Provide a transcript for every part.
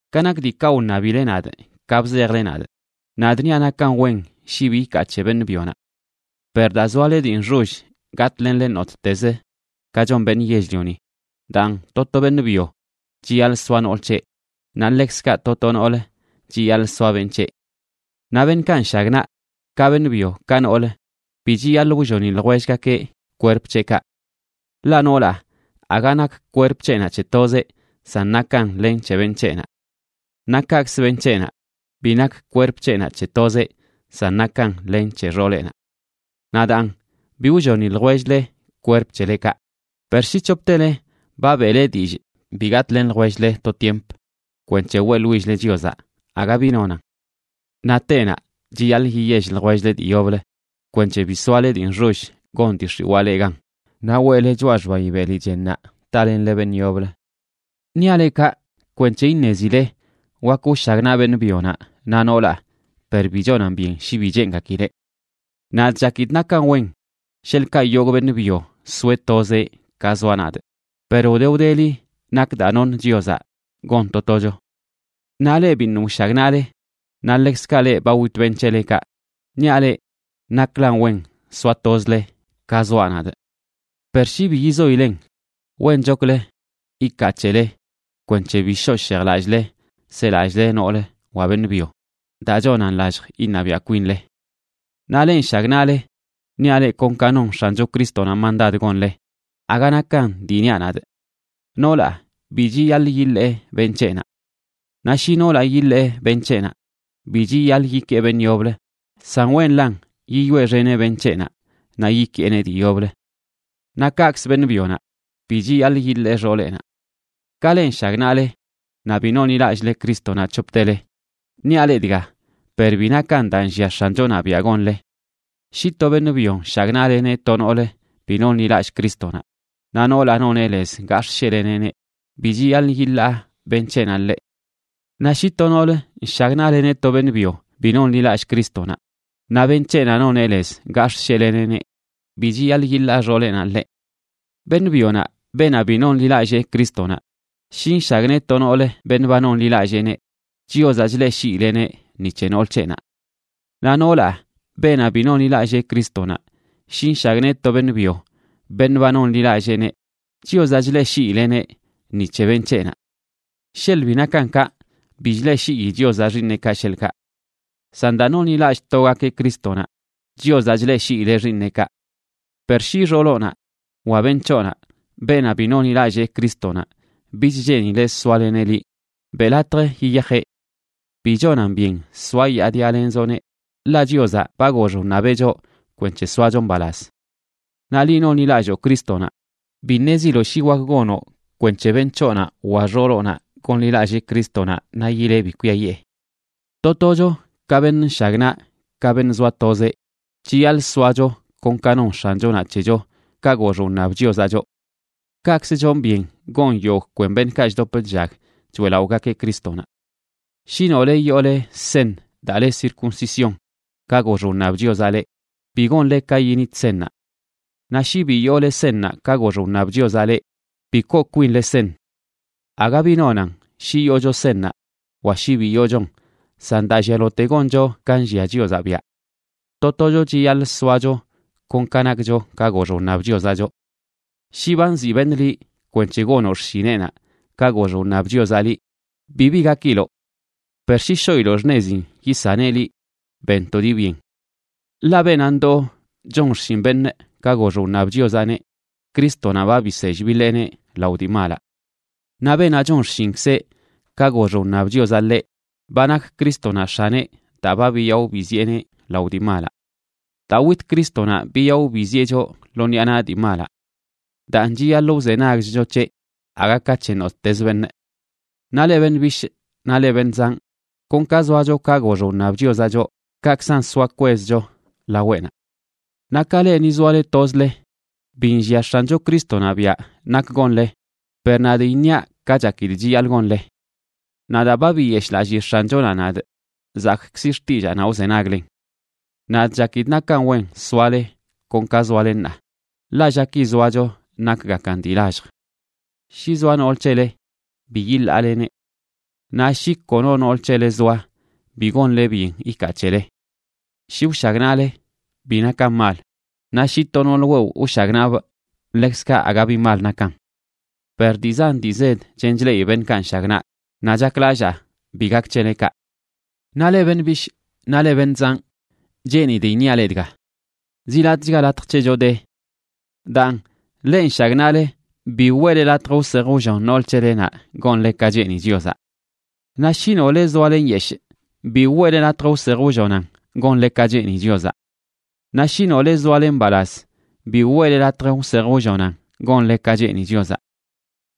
Ka nak diikaꞌ wṉabile nadꞌ ka bzejle nadꞌ, nadꞌ niaꞌ nakan wen shi bi ikaa c̱he beṉꞌ byonaꞌ. Per daa zoale dii nxoll gatꞌlenle nottez ka chon beṉꞌ yell-lioni, daan to to beṉꞌ byo chiyaḻꞌ soa nool c̱heꞌ, naꞌ ḻekzkaꞌ to to noolə chiyaḻꞌ soa beṉꞌ c̱heꞌ. Naꞌ beṉꞌkaꞌ nshagnaꞌ, ka beṉꞌ byo ka nool, bi chiyaḻꞌ wlloni ljwellgakeꞌ kwerp c̱heꞌkaꞌ. Ḻaꞌ noolaꞌ aga nak kwerp c̱heꞌnaꞌ c̱he tozeꞌ, san nakan len c̱he beṉꞌ c̱heꞌnaꞌ. Naꞌ kaꞌkzə beṉꞌ c̱heꞌnaꞌ bi nak kwerp c̱heꞌnaꞌ c̱he tozeꞌ, san nakan len c̱he xooleꞌnaꞌ. Naꞌ daan bi wlloni ljwell-le kwerp c̱helekaꞌ, per shi c̱hoptele ba beꞌle dillꞌ bi gatꞌlen ljwell-le to tiemp kwenc̱he weꞌḻwill-le Chiozaꞌ, aga bi nonan. Naꞌ tenaꞌ chiyaḻꞌ yiyell ljwell-le dii yoblə kwenc̱he bi soale dii nxoll gon dii x̱iwaa leꞌ gan naꞌ weꞌle choꞌa xbayi beli chennaꞌ talenle beṉꞌ yoblə. Niaꞌ leꞌ kaꞌ kwenc̱he iṉezile wak wshagnaꞌ beṉꞌ byonaꞌ naꞌ noolaꞌ, per bi chonan byen shi bi cheengakileꞌ. Nadꞌ chakidꞌ nakan wen sheḻꞌkaꞌ yogꞌ beṉꞌ byo soeꞌ tozeꞌ ka zoaꞌ nadꞌ, per wde wdeli nak daa noṉ Chiozaꞌ gon to tocho. Naꞌ leꞌ biṉꞌ wshagnaꞌle, naꞌ ḻekzkaꞌ leꞌ ba wit beṉꞌ c̱helekaꞌ, niaꞌ leꞌ naklan wen soa tozle, ka zoaꞌ nadꞌ. Per shi bi yizoilen, wenchoklə ikaa c̱hele kwenc̱he bi shoꞌ shejlallꞌle selallꞌle nool wa beṉꞌ byo daa chonan lallj iṉabiaꞌ kwinle. Naꞌ leꞌ nshagnaꞌle, niaꞌ leꞌ kon ka non X̱ancho Crístonaꞌ mandad gonle, aga nakan dii niaꞌ nadꞌ: Noolaꞌ bi chiyaḻꞌ yiḻee beṉꞌ c̱heꞌnaꞌ. Naꞌ shi noolaꞌ yiḻee beṉꞌ c̱heꞌnaꞌ, bi chiyaḻꞌ yikee beṉꞌ yoblə, san wenlan yiyoeꞌxeneꞌ beṉꞌ c̱heꞌnaꞌ naꞌ yikeeneꞌ dii yoblə. Naꞌ kaꞌkzə beṉꞌ byonaꞌ bi chiyaḻꞌ yiḻee xooleꞌnaꞌ. Ka leꞌ nshagnaꞌle naꞌ bi nonḻilallꞌle Crístonaꞌ c̱hoptele, niaꞌ leꞌ dga, per bi nakan daa nllia X̱anchonaꞌ biaꞌ gonle: shi to beṉꞌ byo nshagnaꞌleneꞌ to noolə bi nonḻilallꞌ Crístonaꞌ, naꞌ noolaꞌ noneꞌ lez gax̱ꞌsheꞌleneꞌneꞌ, bi chiyaḻꞌ yiḻaa beṉꞌ c̱heꞌnaꞌ ḻeꞌ. Naꞌ shi to noolə nshagnaꞌleneꞌ to beṉꞌ byo bi nonḻilallꞌ Crístonaꞌ, naꞌ beṉꞌ c̱heꞌnaꞌ noneꞌ lez gax̱ꞌsheꞌleneꞌneꞌ, bi chiyaḻꞌ yiḻaa xooleꞌnaꞌ ḻeꞌ. Beṉꞌ byonaꞌ, beenaꞌ bi nonḻilallee Crístonaꞌ shi nshagnee to noolə beṉꞌ ba nonḻilalleeneꞌ, Chiozaꞌ chleꞌshiileꞌneꞌ ni c̱he nool c̱heꞌnaꞌ. Naꞌ noolaꞌ, beenaꞌ bi nonḻilallee Crístonaꞌ, shi nshagnee to beṉꞌ byo beṉꞌ ba nonḻilalleeneꞌ, Chiozaꞌ chleꞌshiileneꞌ ni c̱he beṉꞌ c̱heꞌnaꞌ. Sheḻꞌ bi nakan kaꞌ, bi chleꞌshii Chiozaꞌ xiiṉeꞌkaꞌ, sheḻꞌkaꞌ. San daa nonḻilallꞌ togakeꞌ Crístonaꞌ, Chiozaꞌ chleꞌshiileꞌ xiiṉeꞌkaꞌ. Per shi xooloꞌnaꞌ wa beṉꞌ c̱hoꞌnaꞌ, beenaꞌ bi nonḻilallee Crístonaꞌ, bich cheenileꞌ soaleneꞌ liꞌ, beꞌ latj yiyajeꞌ. Bi chonan byen soayaadialenzoꞌneꞌ, ḻaꞌ Chiozaꞌ ba gox wṉabeꞌ choꞌ kwenc̱he soacho mbalaz. Naꞌ liꞌ nonḻilalloo Crístonaꞌ, bi ṉeziloꞌ shi wak gonoꞌ kwenc̱he beṉꞌ c̱hoꞌnaꞌ wa xooloꞌnaꞌ gonḻilallee Crístonaꞌ naꞌ yileꞌ bi kwiayiꞌe. To tocho, ka beṉꞌ nshagnaꞌ ka beṉꞌ zoa tozeꞌ, chiyaḻꞌ soacho kon ka non X̱anchonaꞌ c̱hecho ka gox wṉab Chiozaꞌ choꞌ. Kaꞌkzə chonꞌ byen gon yogꞌ kwen beṉꞌkaꞌ chdop chllag choeꞌlaꞌogakeꞌ Crístonaꞌ. Shi nole yoole seṉ daa le circuncisión ka gox wṉab Chiozaꞌ leꞌ, bi gonle ka yinit seṉnaꞌ. Naꞌ shi bi yoole seṉnaꞌ ka gox wṉab Chiozaꞌ leꞌ, bi koo kwinle seṉ. Aga bi nonan shi yoocho seṉnaꞌ wa shi bi yoochon, san daa llialote goncho ka nlliaꞌ Chiozaꞌ biaꞌ. To tocho chiyaḻꞌ soacho kon ka nakcho ka gox wṉab Chiozaꞌ choꞌ. Shi ba nziꞌ beṉꞌ liꞌ kwenc̱he gonoꞌ xshineꞌnaꞌ ka gox wṉab Chiozaꞌ liꞌ, bibi gakiloꞌ. Per shi shoꞌiloꞌ xṉezin yisaneꞌ liꞌ, ben to dii byen. Ḻaꞌ beenaꞌ ndoo chon xshin beṉꞌ ka gox wṉab Chiozaꞌneꞌ, Crístonaꞌ ba bisell biḻeeneꞌ lao dii malaꞌ. Naꞌ beenaꞌ chon xshinkzeꞌ ka gox wṉab Chiozaꞌ ḻeꞌ, ba nak Crístonaꞌ X̱aneꞌ daa ba biyaꞌo biziꞌeneꞌ lao dii malaꞌ. Daa wit Crístonaꞌ biyaꞌo biziꞌe choꞌ lo ṉiꞌa naꞌ dii malaꞌ. Daan chiyaḻꞌ wzenagchcho c̱heꞌ aga ka c̱he nottez beṉꞌ. Naꞌ leꞌ beṉꞌ bishꞌ naꞌ leꞌ beṉꞌ zanꞌ, kon ka zoacho ka gox wṉab Chiozaꞌ choꞌ, kaꞌkzan soa kwezcho laweꞌnaꞌ. Naꞌ ka leꞌ ni zoale tozle, bi nllia X̱ancho Crístonaꞌ biaꞌ nak gonle, per nadꞌ iṉiaꞌ ka chakidꞌ chiyaḻꞌ gonle. Naꞌ daa ba biyeshꞌlallii X̱anchonaꞌ nadꞌ, zakꞌkzi xtillaanaꞌ wzenaglen. Nadꞌ chakidꞌ nakan wen soale kon ka zoale ṉaa, ḻaꞌ llaki zoacho nakgakan dii lallj. Shi zoa nool c̱hele bi yiḻaaleneꞌ. Naꞌ shi kono nool c̱hele zoa, bi gonle byen ikaa c̱hele. Shi wshagnaꞌle, bi nakan mal; naꞌ shi to nool wewꞌ wshagnaꞌbꞌ ḻekzkaꞌ aga bi mal nakan. Per dii zan dii zed chen chleꞌi beṉꞌkaꞌ nshagnaꞌ, naꞌ chaklallaa bi gak c̱hele kaꞌ. Naꞌ leꞌ beṉꞌ bishꞌ naꞌ leꞌ beṉꞌ zanꞌ, cheenidꞌ iṉiaꞌ leꞌ dga: Ziꞌ latꞌchga latj c̱hecho de. Daan, leꞌ nshagnaꞌle, bi weꞌle latj wsej wllon nool c̱helenaꞌ gonle ka cheeni Chiozaꞌ. Naꞌ shi nole zoale nyeshꞌ bi weꞌle latj wsej wllonan gonle ka cheeni Chiozaꞌ. Naꞌ shi nole zoale mbalaz, bi weꞌle latj wsej wllonan gonle ka cheeni Chiozaꞌ.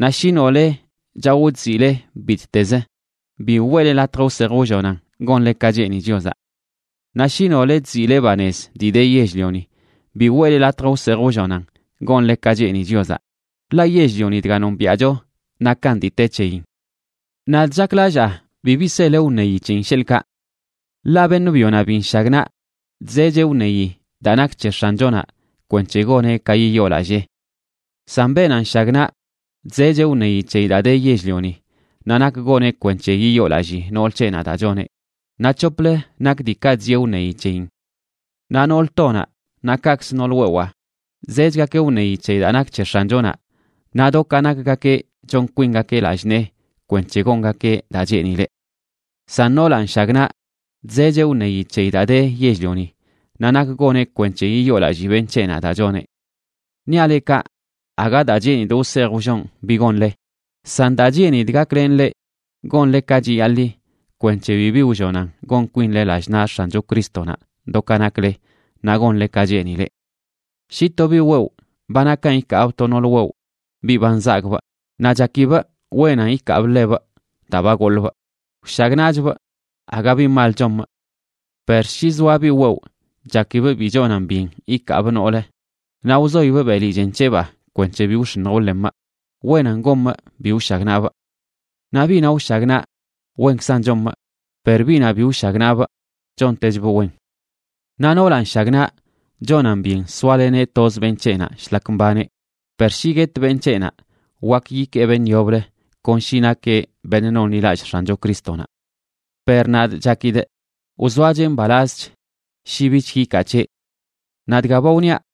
Naꞌ shi nole chaꞌo chziꞌle bittezə, bi weꞌle latj wsej wllonan gonle ka cheeni Chiozaꞌ. Naꞌ shi nole chziꞌle banez dii de yell-lioni, bi weꞌle latj wsej wllonan gonle ka cheeni Chiozaꞌ; ḻaꞌ yell-lioni dga nombiaꞌcho nakan dii te c̱heyin. Nadꞌ chaklallaa bibi sele wṉeyi c̱heyin, sheḻꞌkaꞌ. Ḻaꞌ beṉꞌ byonaꞌ bi nshagnaꞌ chzecheꞌ wṉeyi daa nak c̱he X̱anchonaꞌ kwenc̱he goneꞌ ka yiyoolallee. San beenaꞌ nshagnaꞌ chzecheꞌ wṉeyi c̱heyi daa de yell-lioni naꞌ nak goneꞌ kwenc̱he yiyoolallii nool c̱heꞌnaꞌ daa choneꞌ, naꞌ c̱hoplə nak diikaꞌ chzieꞌ wṉeyi c̱heyin. Naꞌ nool tonaꞌ naꞌ kaꞌkzə nool wewaa zechgakeꞌ wṉeyi c̱he daa nak c̱he X̱anchonaꞌ, naꞌ do ka nakgakeꞌ chon kwingakeꞌ lallꞌ nee kwenc̱he gongakeꞌ daa cheenileꞌ. San noolaꞌ nshagnaꞌ chzecheꞌ wṉeyi c̱heyi daa de yell-lioni naꞌ nak goneꞌ kwenc̱he yiyoolallii beṉꞌ c̱heꞌnaꞌ daa choneꞌ. Niaꞌ leꞌ kaꞌ aga daa cheenidꞌ wsej wllonꞌ bi gonle, san daa cheenidꞌ gaklenꞌ leꞌ gonle ka chiyaḻi, kwenc̱he bibi wllonan gon kwinle lallꞌ naꞌ X̱ancho Crístonaꞌ do ka nakle naꞌ gonle ka cheenileꞌ. Shi to biꞌ wewꞌ ba nakan ikaabꞌ to nool wewꞌ biꞌ ba nzagꞌbꞌ, naꞌ chakibꞌ wenan ikaabꞌ ḻebꞌ daa ba goḻbꞌ, wshagnaꞌchbꞌ, aga bi mal chomꞌ. Per shi zoa biꞌ wewꞌ chakibꞌ bi chonan byen ikaabꞌ noolə naꞌ wzoibꞌ beli chen c̱hebaa kwenc̱he bi wx̱iṉj wḻemꞌ, wenan gomꞌ bi wshagnaꞌbꞌ. Naꞌ biꞌnaꞌ wshagnaꞌ wenkzan chomꞌ, per biꞌnaꞌ bi wshagnaꞌbꞌ chontechbꞌ wen. Naꞌ noolaꞌ nshagnaꞌ, chonan byen soaleneꞌ toz beṉꞌ c̱heꞌnaꞌ,shlak mbaneꞌ; per shi guet beṉꞌ c̱heꞌnaꞌ, wak yikee beṉꞌ yoblə, kon shi nakeꞌ beṉꞌ nonḻilallꞌ X̱ancho Crístonaꞌ. Per nadꞌ chakidꞌ wzoacheꞌ mbalazch shi bich yikaa c̱heꞌ. Naꞌ dga ba wniaꞌ,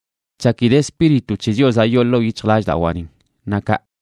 chakidꞌ Espíritu c̱he Chiozaꞌ yoo ḻoo yic̱hjlallꞌdawaꞌnin na kaꞌ.